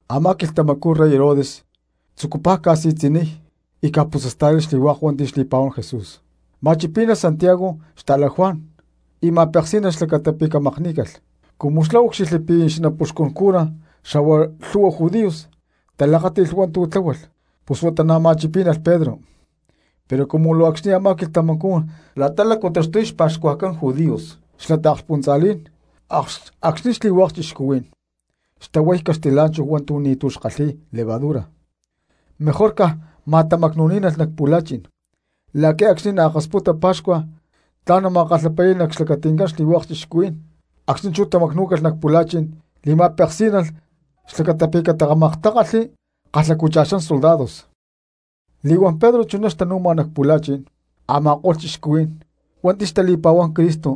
Amá quilhtamacú rey Herodes tzucupaj ca̠si̠tzi̠niy y ca̠putzasta̠lay xli̠hua̠k hua̠nti̠ xtali̠pa̠huán Jesús. Ma̠chipí̠nalh Santiago xta̠la Juan y ma̠peksí̠nalh xlacata pi̠ camakní̠calh. Cumu xlá úcxilhli pi̠ xanapuxcun cura xa̠hua lhu̠hua judíos talakáti̠lh hua̠ntu̠ tláhualh, pus huata na̠ ma̠chipí̠nalh Pedro, pero cumu luu acxni̠ a̠má quilhtamacú xlakcha̠ni̠t la̠ta lácu taxtuy xpa̠xcuajcán judíos xla taakspuntza̠lí̠n acxni̠ xli̠hua̠k cristianos xtahuay caxtilá̠nchahu hua̠ntu̠ ni̠tu̠ kalhi̠y levadura, mejor caj ma̠tamacnu̠ní̠nalh nac pu̠la̠chi̠n la̠qui̠ acxni̠ naakasputa pa̠xcua tla̠n nama̠kalhapali̠y nac xlacati̠ncán xli̠hua̠k cristianos. Acxni̠ chú tamacnú̠calh nac pu̠la̠chi̠n li̠ma̠peksí̠nalh xlacata pi̠ catamaktákalhli kalhacu̠cha̠xán soldados. Li̠huán Pedro chuná xtanu̠ma nac pu̠la̠chi̠n, a̠ma̠ko̠lh cristianos hua̠nti̠ xtali̠pa̠huán Cristo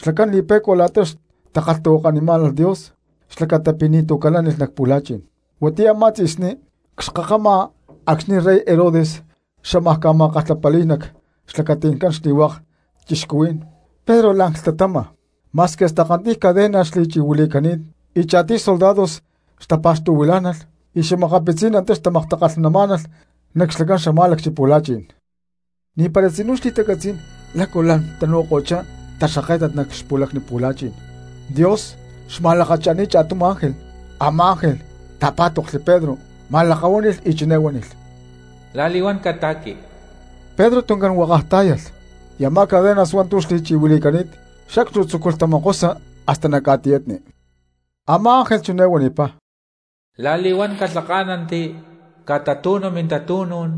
xlacán li̠pe̠cua la̠ta xtakalhtahuakanimá̠nalh Dios xlacata pi̠ ni̠tu̠ calánilh nac pu̠la̠chi̠n. Huatiyá a̠má tzi̠sní cxkakama acxni̠ rey Herodes xamaj ma̠kalhapali̠y nac xlacati̠ncán xli̠hua̠k cristianos, Pedro la̠n clhtamama ma̠squi hasta kantiy cadena xli̠chi̠huili̠cani̠t y cha̠tiy soldados xtapa̠xtu̠huilá̠nalh y xa̠makapitzí̠n antá xtamaktakalhnamá̠nalh nac xlacán xamá̠lacchi pu̠la̠chi̠n. Ni̠para tzinú xali̠catzí̠n lácu ¡lám tanu̠ko̠chá taxkáket nac xpu̠lacni pu̠la̠chi̠n! Dios xma̠lakacha̠ni̠t cha̠tum ángel, a̠má ángel ta̠pá̠toklhli Pedro ma̠lakahuáni̠lh y chiné huánilh: —¡La̠li̠huán cata̠qui! Pedro tuncán huákaj tá̠yalh y a̠má cadenas hua̠ntu̠ xli̠chi̠huili̠cani̠t sacstu tzúculh tatamokosa hasta nac ca̠tiyatni. Amá ángel chiné huanipá: —La̠li̠huán calhaká̠nanti, catatu̠nu mintatu̠nú̠n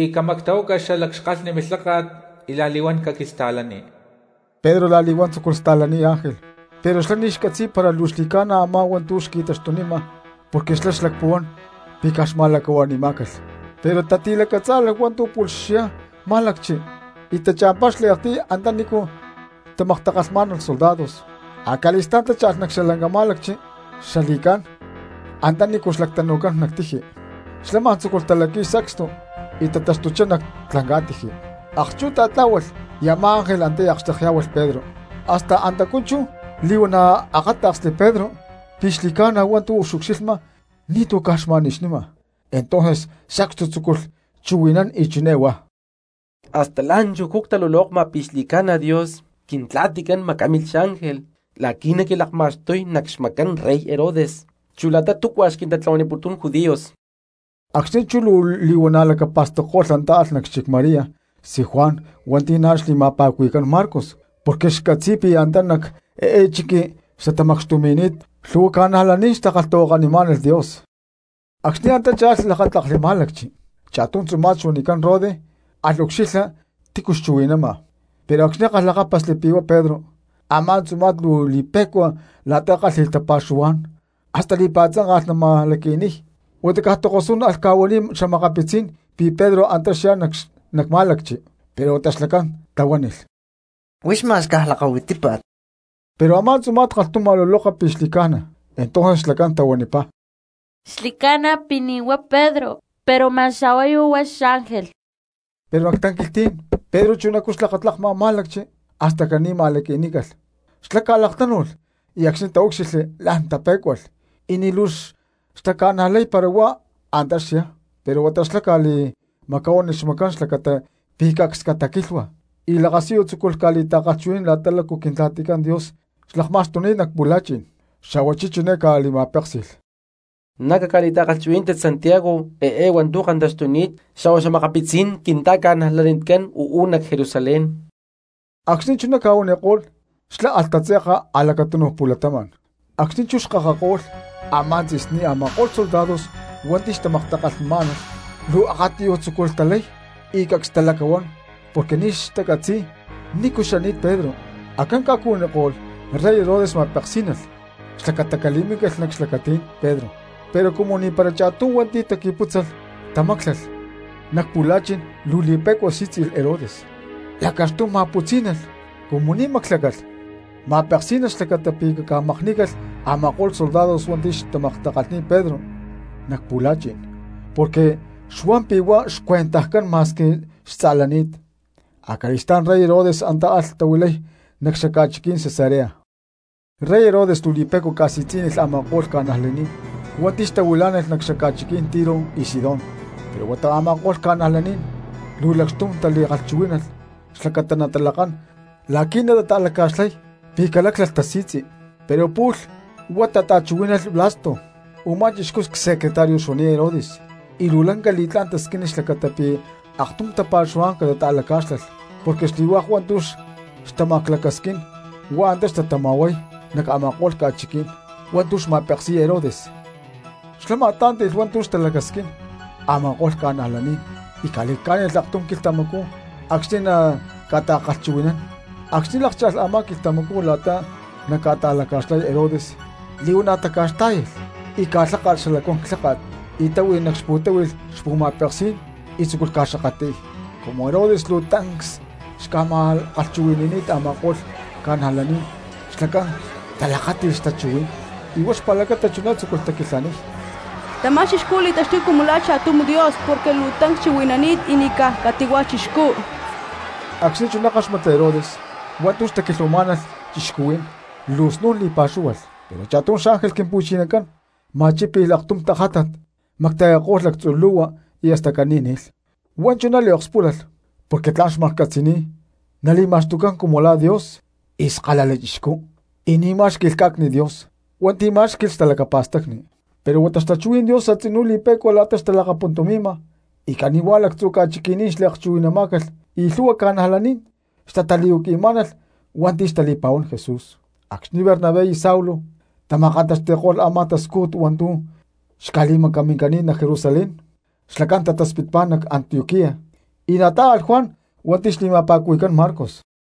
y camactahuaca xalac xkalhni milháka̠t y la̠li̠huán caquista̠lani. Pedro la̠li̠huán tzúculh sta̠laniy ángel, pero xlá ni̠ xcatzi̠y para luu xli̠ca̠na a̠má hua̠ntu̠ xqui̠taxtunima porque xlá xlacpuhuán pi̠ caj xma̠lacahua̠ni̠má̠calh. Pero tati̠lacatzá̠lalh hua̠ntu̠ pu̠lh xyá má̠lacchi y tacha̠mpá xliaktiy antanícu na̠ xtamaktakalhnamá̠nalh soldados, acali̠stá̠n tácha̠lh nac xalanca má̠lacchi xla li̠cá̠n antanícu lactaxtucán nac tiji, xlá ma̠n tzúculh talaqui̠y sacstu y tataxtuchá nac lanca̠tiji. Akchú tatlá̠hualh y a̠má ángel antá akxtekyá̠hualh Pedro. Hasta antacú chú li̠huana̠ akáta̠ksli Pedro pi̠ xli̠ca̠na hua̠ntu̠ xucxilhma y ni̠tu̠ caj xma̠nixnima. Entonces sacstu tzúculh chuhui̠nán y chiné huá: —Hasta la̠nchujcú ctalulokma pi̠ xli̠ca̠na Dios Quintla̠ticán macámilh xángel la̠qui̠ naquilakma̠xtuy nac xmacán rey Herodes chu la̠ta túcua xquintatlahuaniputún judíos. Acxni̠ chú luu li̠huana̠ lacapa̠stacko̠lh antá alh nac xchic María xtzí Juan hua̠nti̠ na̠ xli̠ma̠pa̠cuhui̠cán Marcos, porque xcatzi̠y pi̠ antá nac eé chiqui xtatamacxtumi̠ni̠t lhu̠hua cristianos xtakalhtahuakanimá̠nalh Dios. Acxni̠ antá cha̠lh lakátlakli má̠lacchi, cha̠tum tzuma̠t xuanicán Rode alh ucxilha tícu xchuhui̠nama. Pero acxni̠ kalhlakápasli pi̠ huá Pedro, a̠má tzuma̠t luu li̠pe̠cua la̠ta kálhi̠lh tapa̠xuhuá̠n hasta li̠pa̠tzánka̠lh nama̠laqui̠niy, huata caj tokosú̠n alh ca̠huaniy xa̠makapitzí̠n pi̠ Pedro antá xyá nac má̠lacchi. Pero huata xlacán tahuánilh: —¡Huix ma̠x caj lakahuitípa̠t! Pero a̠má tzuma̠t kalhtum xma̠luloka pi̠ xli̠ca̠na. Entonces xlacán tahuanipá: —Xli̠ca̠na pi̠ ni̠huá Pedro, pero ma̠x a̠huayu huá xángel. Pero nac tanquilhtí̠n Pedro chunacú xlakatlakma má̠lacchi, hasta caní ma̠laqui̠nícalh. Xlá ca̠laktánu̠lh y acxni̠ taúcxilhli la̠n tapé̠cualh y ni̠ luu xtaca̠najlay para huá antá xyá. Pero huata xlá ca̠li̠macahuánilh xmacán xlacata pi̠ cacs cataquilhua y lakasiyu tzúculh ca̠li̠ta̠kalhchuhui̠nán la̠ta lácu Quintla̠ticán Dios xlakma̠xtuni̠t nac pu̠la̠chi̠n. Xa̠huachí chiné ca̠li̠ma̠péksi̠lh: —Na̠ caca̠li̠ta̠kalhchuhui̠nántit Santiago eé hua̠ntu̠ kantaxtuni̠t xa̠hua xa̠makapitzí̠n quinta̠ca̠najlanicán uú nac Jerusalén. Acxni̠ chuná ca̠huaniko̠lh xlá alh tatze̠ka a̠lacatúnuj pu̠latama̠n. Acxni̠ chú xkakako̠lh a̠má tzi̠sní a̠ma̠ko̠lh soldados hua̠nti̠ xtamaktakalhmá̠nalh luu akatiyuj tzúculh talay y cacs xtalacahuán porque ni̠ xtacatzi̠y nícu xani̠t Pedro. Ca̠cuhuiní acxni̠ rey Herodes ma̠peksí̠nalh xlacata cali̠minícalh nac xlacatí̠n Pedro, pero cumu ni̠para cha̠tum hua̠nti̠ taqui̠pútzalh tamáclalh nac pu̠la̠chi̠n luu li̠pe̠cua sí̠tzi̠lh Herodes, lacaxtum ma̠putzí̠nalh, cumu ni̠ máclalh ma̠peksí̠nalh xlacata pi̠ caca̠makní̠calh a̠ma̠ko̠lh soldados hua̠nti̠ xtamaktakalhni̠t Pedro nac pu̠la̠chi̠n porque xuan pi̠ huá xcuentajcán ma̠squi xtza̠lani̠t. Acali̠stá̠n rey Herodes antá alh tahuilay nac xaca̠chiquí̠n Cesarea. Rey Herodes luu li̠pe̠cua xca̠si̠tzi̠niy a̠ma̠ko̠lh cristianos hua̠nti̠ xtahuilá̠nalh nac xaca̠chiqui̠ní̠n Tiro y Sidón. Pero huata a̠ma̠ko̠lh cristianos luu lacxtum tali̠lacchuhuí̠nalh xlacata natalakán la̠qui̠ natata̠laca̠xlay pi̠ caláclalh tasi̠tzi; pero pu̠lh huá tata̠chuhuí̠nalh Blasto u̠má chixcú csecretario xuani̠t Herodes y luu lanca li̠tlá̠n tasquínilh xlacata pi̠ aktum tapa̠xuhuá̠n caca̠ta̠lacá̠xlalh. Porque xli̠hua̠k hua̠ntu̠ xtamaclacasquín hua̠k antá xtatama̠huay nac a̠ma̠ko̠lh ca̠chiqui̠ní̠n hua̠ntu̠ xca̠ma̠peksi̠y Herodes. Xlá ma̠tlá̠nti̠lh hua̠ntu̠ xtalacasquín a̠ma̠ko̠lh cristianos y ca̠li̠lhcá̠nilh aktum quilhtamacú acxni̠ naca̠ta̠kalhchuhui̠nán. Acxni̠ lákcha̠lh a̠má quilhtamacú la̠ta naca̠ta̠laca̠xlay Herodes li̠huana̠ taca̠xtá̠yalh y ca̠lháka̠lh xalacuán clháka̠t y táhui nac xpu̠táhui̠lh xpu̠ma̠peksí̠n tzúculh ca̠xakatli̠y. Cumu Herodes luu tancs xca̠ma̠kalhchuhui̠ni̠ni̠t a̠ma̠ko̠lh cristianos xlacán talakáti̠lh xtachuhuí̠n y huá xpa̠lacata chiné tzúculh taquilhaniy: —¡Tamá chixcú li̠taxtuy cumu la̠ cha̠tum dios porque luu tancs chuhui̠nani̠t, y ni̠ caj cati̠hua̠ chixcú! Acxni̠ chuná káxmatli Herodes hua̠ntu̠ xtaquilhuamá̠nalh cristianos luu snu̠n li̠pa̠xúhualh, pero cha̠tum xángel Quimpu̠chinacán ma̠chípi̠lh aktum tajátat, macta̠yako̠lh lactzu lu̠hua y hasta caní ni̠lh. Huá chuná liokspúlalh porque tla̠n maklhcátzi̠lh nali̠ma̠xtucán cumu la̠ dios y skalala chixcú y ni̠ má̠xqui̠lh cá̠cni̠t Dios hua̠nti̠ má̠xqui̠lh talacapa̠stacni. Pero huata xtachuhuí̠n Dios a̠tzinú li̠pe̠cua la̠ta xtalakapuntumi̠ma y cani̠huá lactzu̠ ca̠chiqui̠ní̠n xliakchuhui̠namá̠calh y lhu̠hua cristianos xtatali̠huaqui̠má̠nalh hua̠nti̠ xtali̠pa̠huán Jesús. Acxni̠ Bernabé y Saulo tama̠kantaxti̠ko̠lh a̠má tascújut hua̠ntu̠ xca̠li̠maca̠ncani̠t nac Jerusalén xlacán tataspitpá nac Antioquía, y na̠ tatá̠alh Juan hua̠nti̠ xli̠ma̠pa̠cuhui̠cán Marcos.